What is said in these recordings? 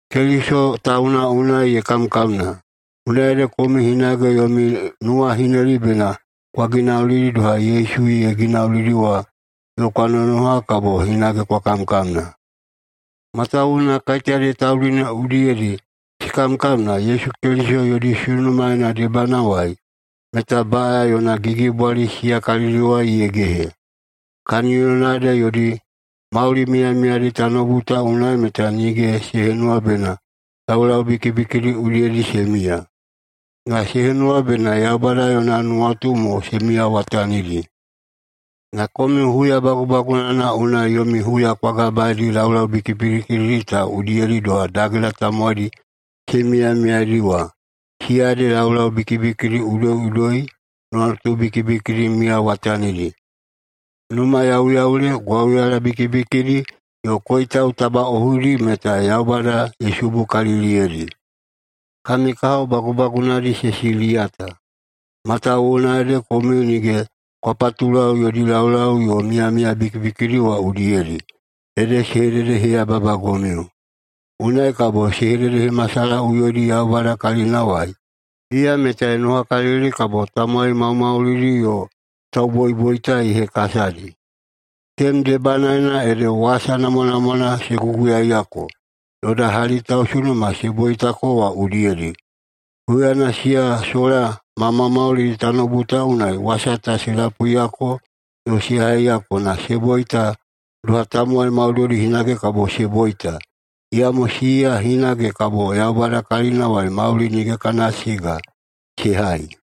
Keliso tauna unai ye kamkamna, unai ede komiu hinage yomi nuwahineli bena kwa ginaulidi doha Yesu ye ginauli wa yo kwa nonoha kabo hinage kwa kamkamna. Matawuwuna kaiteyadi taudi ne udiyedi se kamkamna Yesu Keliso yodi sunumaena debanawai, meta baꞌaya yona gigibwali siya kalidiwai ye gehe. Kaniyona ede yodi mauli miyamiyadi tanoubu ta unai meta nige se henuwa bena laulau bikibikidi udiyedi se miya, na se henuwa bena Yaubada yona nuwatu mo se miyawatanidi. Na komiu huya bagubagunana unai yomi huya kwa gabaedi laulau bikibikidi ta udiyedi doha dagela tamowaidi se miyamiyaedi wa. Siya ede laulau bikibikidi udoiꞌudoi, nuwatu bikibikidi miyawatanidi, numayauyaule, gwauyala bikibikidi, yo koitau tabaꞌohuidi meta Yaubada ye subukaliliyeidi. Kami kahao bagubagunadi se siliyata, matawuwuna ede komiu nige kwa patulau yodi laulau yo miyamiya bikibikidi wa udiyedi, ede se hededeheyababagomiu. Unai kabo se hededehemasalahaꞌuyoidi Yaubada kalinawai. Iya meta ye nonohakalili kabo tamowai maumaulidi yo tauboiboita ye hekasadi. Tenem debanaena ede wasa namwanamwana se guguyaiyako yoda hali tausunuma se boitako wa udiyedi. Huyana siya sola ma maumaulidi tanoubu ta unai wasa ta se lapuiyako yo se haiyako na se boita doha tamowai maudoidi hinage kabo se boita. Iyamo siya hinage kabo Yaubada kalinawai mauli nige kana siga se hai.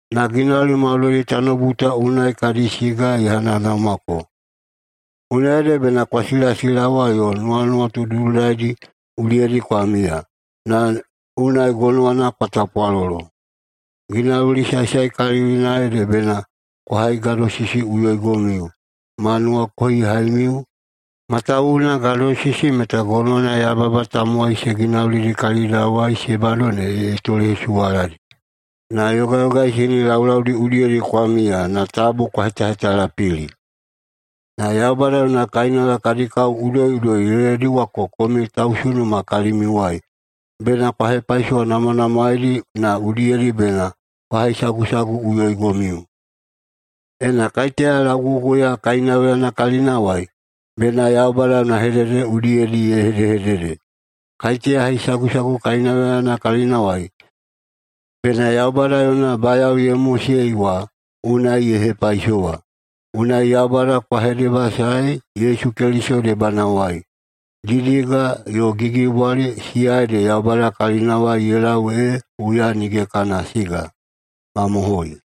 Na ginauli maudoidi tanoubu ta unai kadi siga ye hanahanaumako, unai ede bena kwa silasilawa yo nuwanuwatu dudulaidi udiyedi kwa miya, na unai gonowana kwa tapwalolo. Ginauli saesaekalilina ede bena kwa haigadosisiꞌuyoigomiu ma nuwakohihaimiu, matawuwuna gadosisi meta gonowana yababa tamowai se ginaulidi kalidawai se bado ne ye tolehesuwaladi. Na yogayogaisini laulaudi udiyedi kwa miya na tabu kwa hetahetalapili. Na Yaubada yona kainauya kadi kao udoiꞌudoi ye lediwako komiu tausunuma kalimiuwai. Bena kwa hepaisowanamwanamwaeidi na udiyedi bena kwa haisagusaguꞌuyoigomiu. Ena kaiteya lauguguya kainauyana kalinawai, bena Yaubada yona hedehedede udiyedi ye hedehedede. Kaiteya haisagusagu kainauyana kalinawai, bena Yaubada yona bayao ye mosei wa unai ye hepaisowa. Unai Yaubada kwa hedebasaei Yesu Keliso debanawai. Didiga yo gigibwali siya ede Yaubada kalinawai ye lau ee huya nige kana siga. Mamohoi!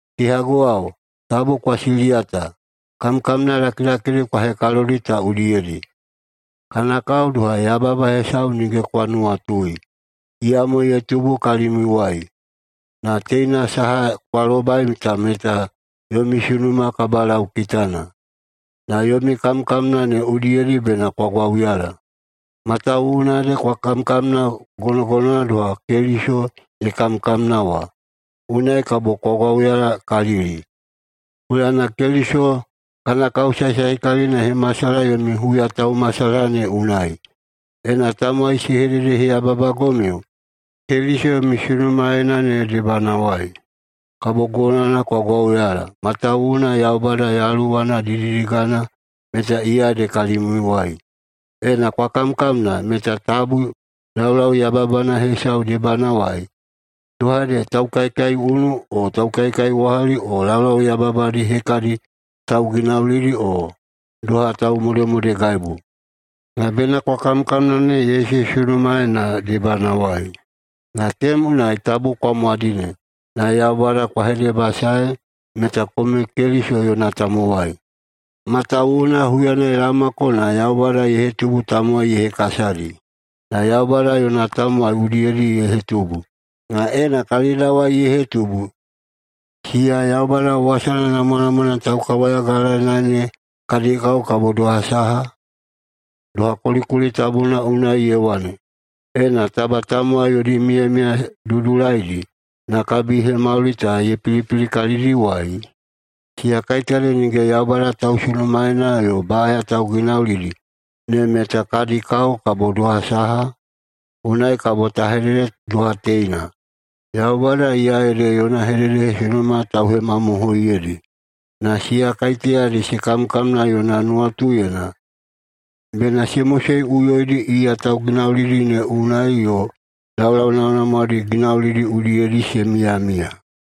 Kehaguwao, tabu kwa siliyata kamkamna lakilakidi kwa hekalodi ta udiyedi. Kana kao doha yababa hesau nige kwa nuwatui, iyamo ye tubu kalimiuwai. Na teina saha kwa lobaidi ta meta yomi sunuma kabalaukitana. Na yomi kamkamna ne unai bena kwa gwauyala, matawuwuna ede kwa kamkamna gonogonowana doha Keliso ye kamkamna wa. Unai kabo kwa gwauyalakalili, huyana Keliso kana kao saesaekalilina ye hemasalaha yona huyataumasalahama ne unai. Ena tamowai se hededeheyaheyababagomiu Keliso yomi sunumaena ne debanawai, kabo gonowana kwa gwauyala, matawuwuna Yaubada Yaluwana didididigana meta iya ede kalimiuwai. Ena kwa kamkamna, meta tabu laulau yababana hesau debanawai, doha ede taukaikaiunu o taukaikaiwahali o laulau yabayababadi hekadi tauginaulidi o doha taumodemodegaibu. Na bena kwa kamkamna ne Yesu sunumaena debanawai, na tenem unai tabu kwa mwadine, na Yaubada kwa hedebasaei meta komiu Keliso yona tamowai. Matawuwuna huyana ye laomako na Yaubada ye hetubu tamowai ye hekasadi. Na Yaubada yona tamowai udiyedi ye hetubu. Na ena kalidawai ye hetubu, siya Yaubada wasana namwanamwa taukawayagalaeina ne kadi kao kabo doha saha? [Doha kulikuli tabuna unai ye wane,] “Ena taba tamowai yodi miyamiya dudulaidi na kabihemauli ta ye pilipili kalidiwai, siya kaiteyadi nige Yaubada tausunumaena yo baꞌaya tauginaulidi ne meta kadi kao kabo doha saha?” Unai kabo ta hedede doha teina: Yaubada iya ede yona hededehesunuma tauhemamohoiyeidi. Na siya kaiteyadi se kamkamna yona nuwatuyena, bena se moseꞌuyoidi iya tauginaulidi ne unai yo laulau namwanamwadi ginaulidi udiyedi se miyamiya.